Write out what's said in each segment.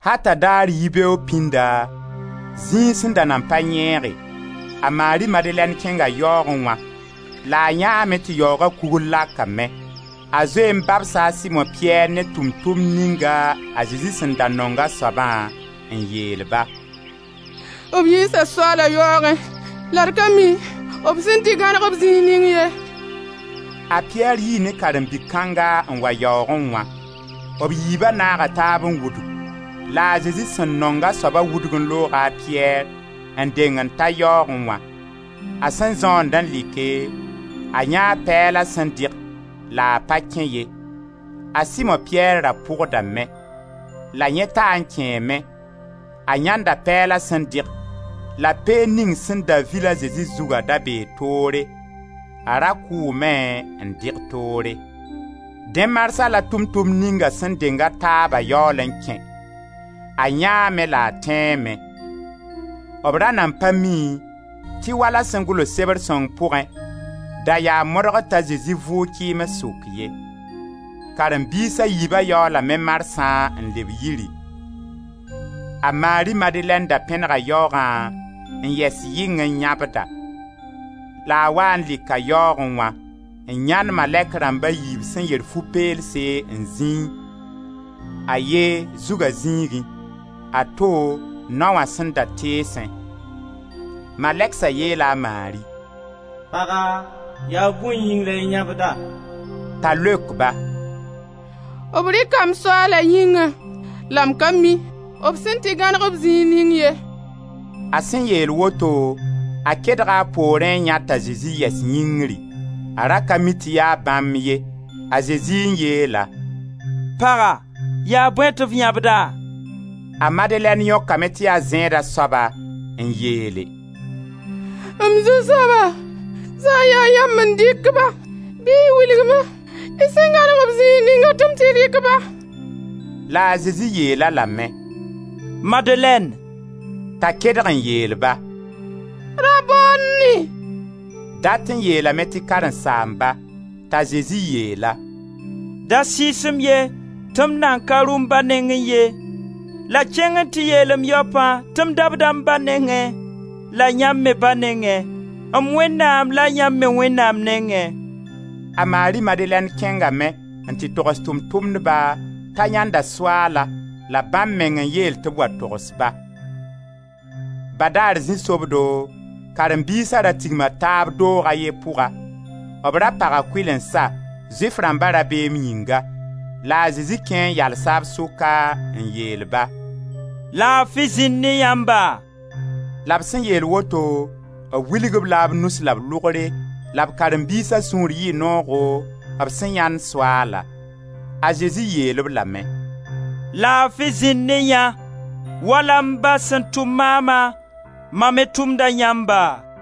Ata daar yibeoogo pĩnda, zĩig sẽn da nan pa yẽege, a Mari Madelɛn kẽnga yaoogẽ wã la a yãeeme tɩ yaooga kugr lakame. A zoe n babsa a Simo-Piyɛr ne Tʋʋm-tʋmd ninga a Zezi sẽn da nong a soabã, n yeel-ba: «B yiisa Soaala yaoogẽ la d ka mi b sẽn tɩ gãneg-b zĩig ning ye.» A Piyɛr yii ne karen-bi kãnga n wa yaoogẽ wã. B yiiba naaga taab n wudg, la a Zezi sẽn nong a soaba wudg n looga a Piyɛr, n deng n ta yaoogẽ wã. A sẽn zõond n like, a yãee pɛɛla sẽn dɩg la a pa kẽ ye. A Simo-Piyɛr ra pʋgdame, la yẽ taa n kẽeme; a yãenda pɛɛlã sẽn dɩg, la peend ning sẽn da vil a Zezi zuga da bee toore, a ra kʋʋme n dɩg toore. Dẽ marsã la Tʋʋm-tʋmd ninga sẽn denga taabã yaool n kẽ; a yãeeme la a tẽeme. B ra nan pa mi, tɩ wala sẽn gʋls Sebr sõng pʋgẽ, da yaa modgr t'a Zezi vʋʋg kɩɩms sʋk ye. Karen-biis a yiiba yaoolame marsã n leb yiri. A Mari Madelɛn da pẽnega yaoogã n yɛs yɩng n yãbda, la a waa n lɩka yaoogẽ wã, n yãend malɛk rãmb a yiib sẽn yer fu peelse n zĩi, a ye, zuga zĩigẽ, a to, nao wã sẽn da teesẽ. Malɛgsa yeela a Mari: «Paga, yaa bõe yĩng la y yãbda?» T'a leok ba: «B rɩka m Soaala yĩnga la m ka mi b sẽn tɩ gãneg-b zĩig ning ye.» A sẽn yeel woto, a kedga a poorẽ n yãe t'a Zezi yɛs yĩngri; a ra ka mi tɩ yaa bãmb ye. A Zezi n yeel-a: «Paga, yaa bõe tɩ f yãbda?» A Madelɛn yõkame tɩ yaa zẽeda soaba, n yeele: «M zu-soaba, sã n ya yãmb n dɩk-ba bɩ y wilg-ma y sẽn gãneg-b zĩig ninga tɩ m tɩ rɩk-ba.» La a Zezi yeel-a lame: «Madelɛn!» T'a kedg n yeel-ba: «Rabonni», dat n yeelame tɩ karẽn-saamba. T'a Zezi yeel-a: «Da sɩɩs-m ye, tɩ m nan ka rʋ m Ba nengẽ ye, la kẽng n tɩ yeel m yaopã tɩ m daba m Ba la yãmb me Ba nengẽ, m Wẽnnaam la yãmb me Wẽnnaam nengẽ.» A Mari Madelɛn kẽngame n tɩ togs Tʋʋm-tʋmdba t'a yãenda Soaalã la bãmb meng n yeel tɩ b wa togs-ba. Badaar zĩ-sobdo, karen-biisa ra tigma taab doog a ye pʋga; b ra paga kʋɩlensa, Zʋɩf rãmba rabeem yĩnga la a Zezi kẽ n yalsa b sʋka n yeel-ba: «Laafi zĩnd ne yãmba!» La b sẽn yeel woto b wilg-b la b nus la b lʋgre la karen-biisa sũur yɩɩ noogo b sẽn yãend Soaalã. A Zezi yeel-b lame: «Laafi zĩnd ne yã! Wala m Ba sẽn tʋm maama, ma me tʋmda yãmba.»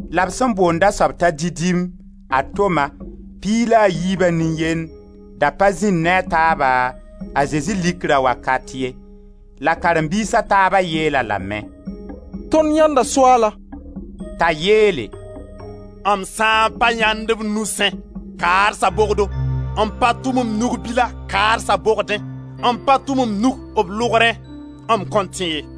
La b sẽn boond a soab t'a Didim, a Toma, piig la a yiiba nin-yend, da pa zĩnd ne a taaba a Zezi likra wakat ye. La karen-biis a taaba yeel-a lame: «Tõnd yãenda Soaalã!» T'a yeele: «M sã n pa yãend b nusẽ, kaadsa bogdo, n pa tʋm m nug-bila kaadsa bogdẽ, n pa tʋm m nug b lʋgrẽ, m kõn tẽ ye.»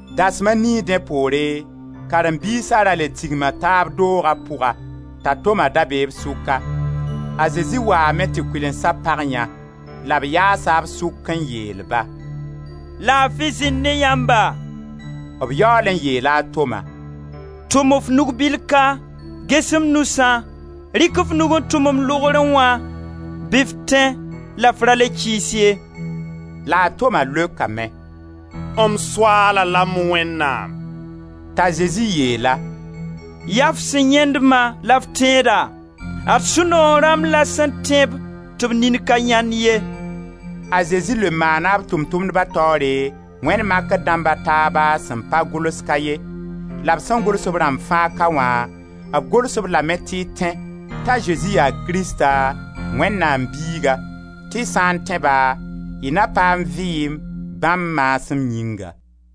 Dasem a nii dẽ poore, karen-biisa ra le tigma taab dooga pʋga, t'a Toma be b sʋka. A Zezi waame tɩ kʋɩlensa pag yã la b yaasa b sʋk n yeel-ba: «Laafi zĩnd ne yãmba!» B yaool n yeela a Toma: «Tʋm f nug-bil ka, ges m nusã, rɩk f nug n tʋm m lʋgrẽ wã, bɩ f tẽ la f ra le kɩɩs ye.» La a Toma leokame: «M Soaala la m Wẽnnaam!» T'a Zezi yeel-a: «Ya f sẽn yãend-ma la f tẽeda. Ad sũ-noog rãmb la sẽn tẽ-b tɩ b nin ka yãend ye.» A Zezi le maana b Tʋʋm-tʋmdba taoore wẽnd makr dãmb a taaba sẽn pa gʋls ka ye. La b sẽn gʋls-b rãmb fãa ka wã, b gʋls b lame tɩ y tẽ t'a Zezi yaa Krista, Wẽnnaam Biiga, tɩ y sã n tẽ-ba y na paam vɩɩm bãmb maasem yĩnga.